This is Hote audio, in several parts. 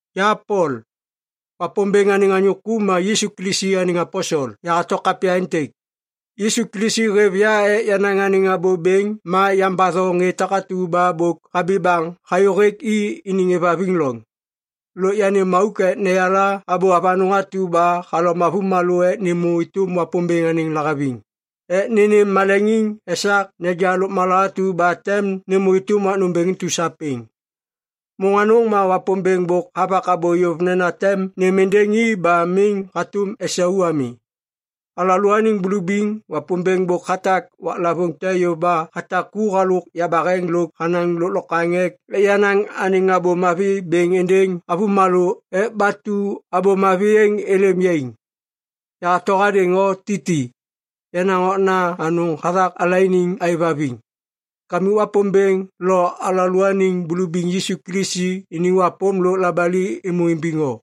Ya Pol, Wapômbêŋ anêŋ anyô ku ma Yisu Kilisi anêŋ aposel, yahato kapya êntêk. Yisu Kilisi hêv ya ek yanaŋ anêŋ abô bêŋ ma yambatho ŋê takatu ba bôk habi baŋ hayô hêk i iniŋ êvhaviŋ loŋ. Lôk yanêm auk ek neyala abô avanôŋ atu ba halom avômalô ek nêmô êtôm Wapômbêŋ anêŋ lahaviŋ ek nênêm maleŋiŋ esak neja lôkmala atu ba tem nêmô êtôm wak nômbêŋ intu sapêŋ. Môŋ anôŋ ma Wapômbêŋ bôk havak abô yôv nena tem nêm êndêŋ i ba miŋ hatôm esau ami. Alalôaniŋ bulubiŋ Wapômbêŋ bôk hatak waklavôŋ te yôv ba hatak ku halôk yabaheŋ lôk hanaŋ lôklokwaŋ ek yanaŋ anêŋ Abô Mavi bêŋ êndêŋ avômalô ek batu Abô Mavi êŋ êlêm yaiŋ. Yahato hadêŋ o Titi, yenaŋ okna anôŋ hathak alaianiŋ aêvhaviŋ. Kamik Wapômbêŋ lo alalôaniŋ Bulubiŋ Yisu Kilisi iniŋ wapôm lôk labali êmô imbiŋ o.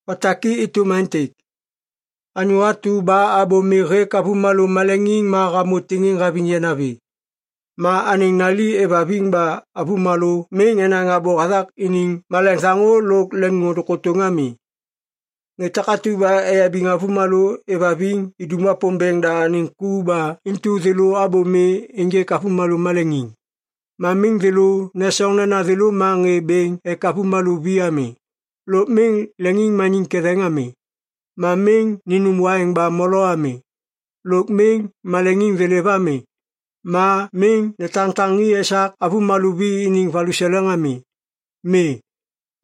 Otak i êtôm aêntêk. Anyô atu ba abô mi hêk avômalô maleŋiŋ ma hamô tiŋiŋ haviŋ yanavi. Ma anêŋ nali êvhaviŋ ba avômalô miŋ enaŋ abô hathak iniŋ maleŋ thaŋô lôk leŋôndôŋ kôtôŋ ami. Ŋê takatu ba eyabiŋ avômalô êvhaviŋ idum Wapômbêŋ da anêŋ ku ba intu thêlô abô mi ênjêk avômalô maleŋiŋ. Ma miŋ thêlô nesoŋ nena thêlô ma ŋê bêŋ ek avômalô vi ami, lôk miŋ leŋiŋmaniŋ ketheŋ ami, ma miŋ ninum waiŋ ba molo ami, lôk miŋ maleŋiŋ thêlêv ami, ma miŋ netaŋtaŋi esak avômalô vi iniŋ valuseleŋ ami. Mi.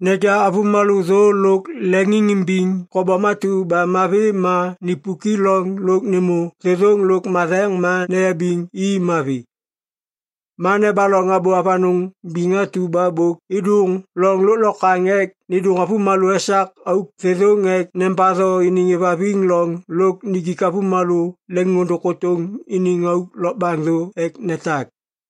Neja avômalô thô lôk leŋiŋimbiŋ kobom atu ba mavi ma nipuk i loŋ lôk nêmô thêthôŋ lôk matheŋ ma neyabiŋ i mavi. Ma nebaloŋ abô avanôŋ biŋ atu ba bôk êdôŋ loŋ lôklokwaŋ ek nêndôŋ avômalô esak auk thêthôŋ ek nembatho iniŋ êvhaviŋ loŋ lôk nijik avômalô leŋôndôŋ kôtôŋ iniŋ auk lokbaŋ thô ek netak.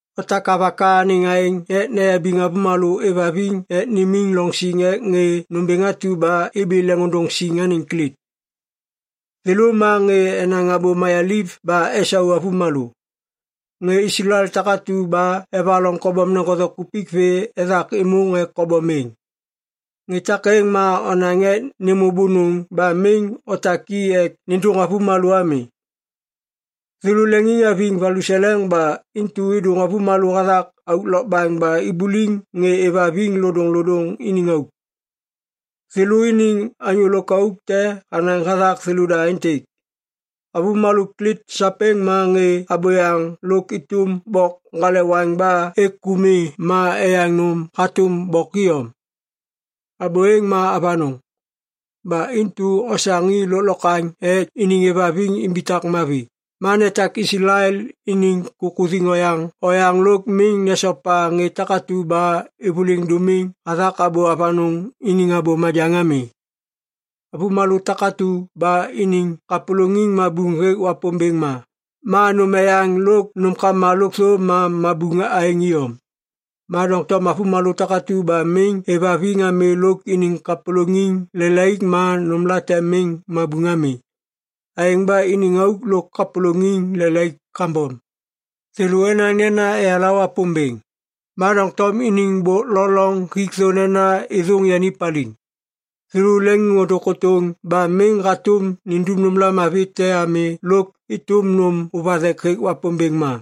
Otak avaka anêŋ aêŋ ek neyabiŋ avômalô êvhaviŋ ek nimiŋ loŋ siŋ ek ŋê nômbêŋ atu ba ibi leŋôndôŋ siŋ anêŋ Klit. Thêlô ma ŋê enaŋ abô mayaliv ba esau avômalô. Ŋê Islael takatu ba evaloŋ kobom neŋgothe kupik vê ethak êmôŋ ek kobom êŋ. Ŋê takêŋ ma onaŋ ek nêmô bônôŋ ba miŋ otak i ek nêndôŋ avômalô ami. Thêlô leŋiŋhaviŋ valuseleŋ ba intu êdôŋ avômalô hathak auk lokbaŋ ba ibuliŋ ŋê êvhaviŋ lodôŋlodôŋ iniŋ auk. Thêlô iniŋ anyô lôkauk te hanaŋ hathak thêlôda aêntêk, “Avômalô Klit sapêŋ ma ŋê abôyaŋ lôk êtôm bok ŋgalewaŋ ba êk ku mi ma eyaŋ nôm hatôm bok iyom.” Abô êŋ ma avanôŋ. Ba intu osaŋ i lôklokwaŋ ek iniŋ êvhaviŋ imbitak mavi ma netak Islael iniŋ kukuthiŋ oyaŋ oyaŋ lôk miŋ nesopa ŋê takatu ba êvôliŋ dômiŋ hathak abô avanôŋ iniŋ abô majaŋ ami. Avômalô takatu ba iniŋ kapôlôŋiŋ mabuŋ hêk Wapômbêŋ ma, ma nôm eyaŋ lôk nômkama lôkthô ma mabuŋ aêŋ iyom. Ma doŋtom avômalô takatu ba miŋ êvhaviŋ ami lôk iniŋ kapôlôŋiŋ lelaik ma nômlate miŋ mabuŋ ami. Aêŋ ba iniŋ auk lôk kapôlôŋiŋ lelaik kambom. Thêlô enaŋ nena eyala Wapômbêŋ, ma doŋtom iniŋ bôk lo loŋ hik thô nena êthôŋ yani paliŋ. Thêlô leŋiŋôndôŋ kôtôŋ ba miŋ hatôm nindum nômla mavi te ami lôk êtôm nôm ôvathek hêk Wapômbêŋ ma.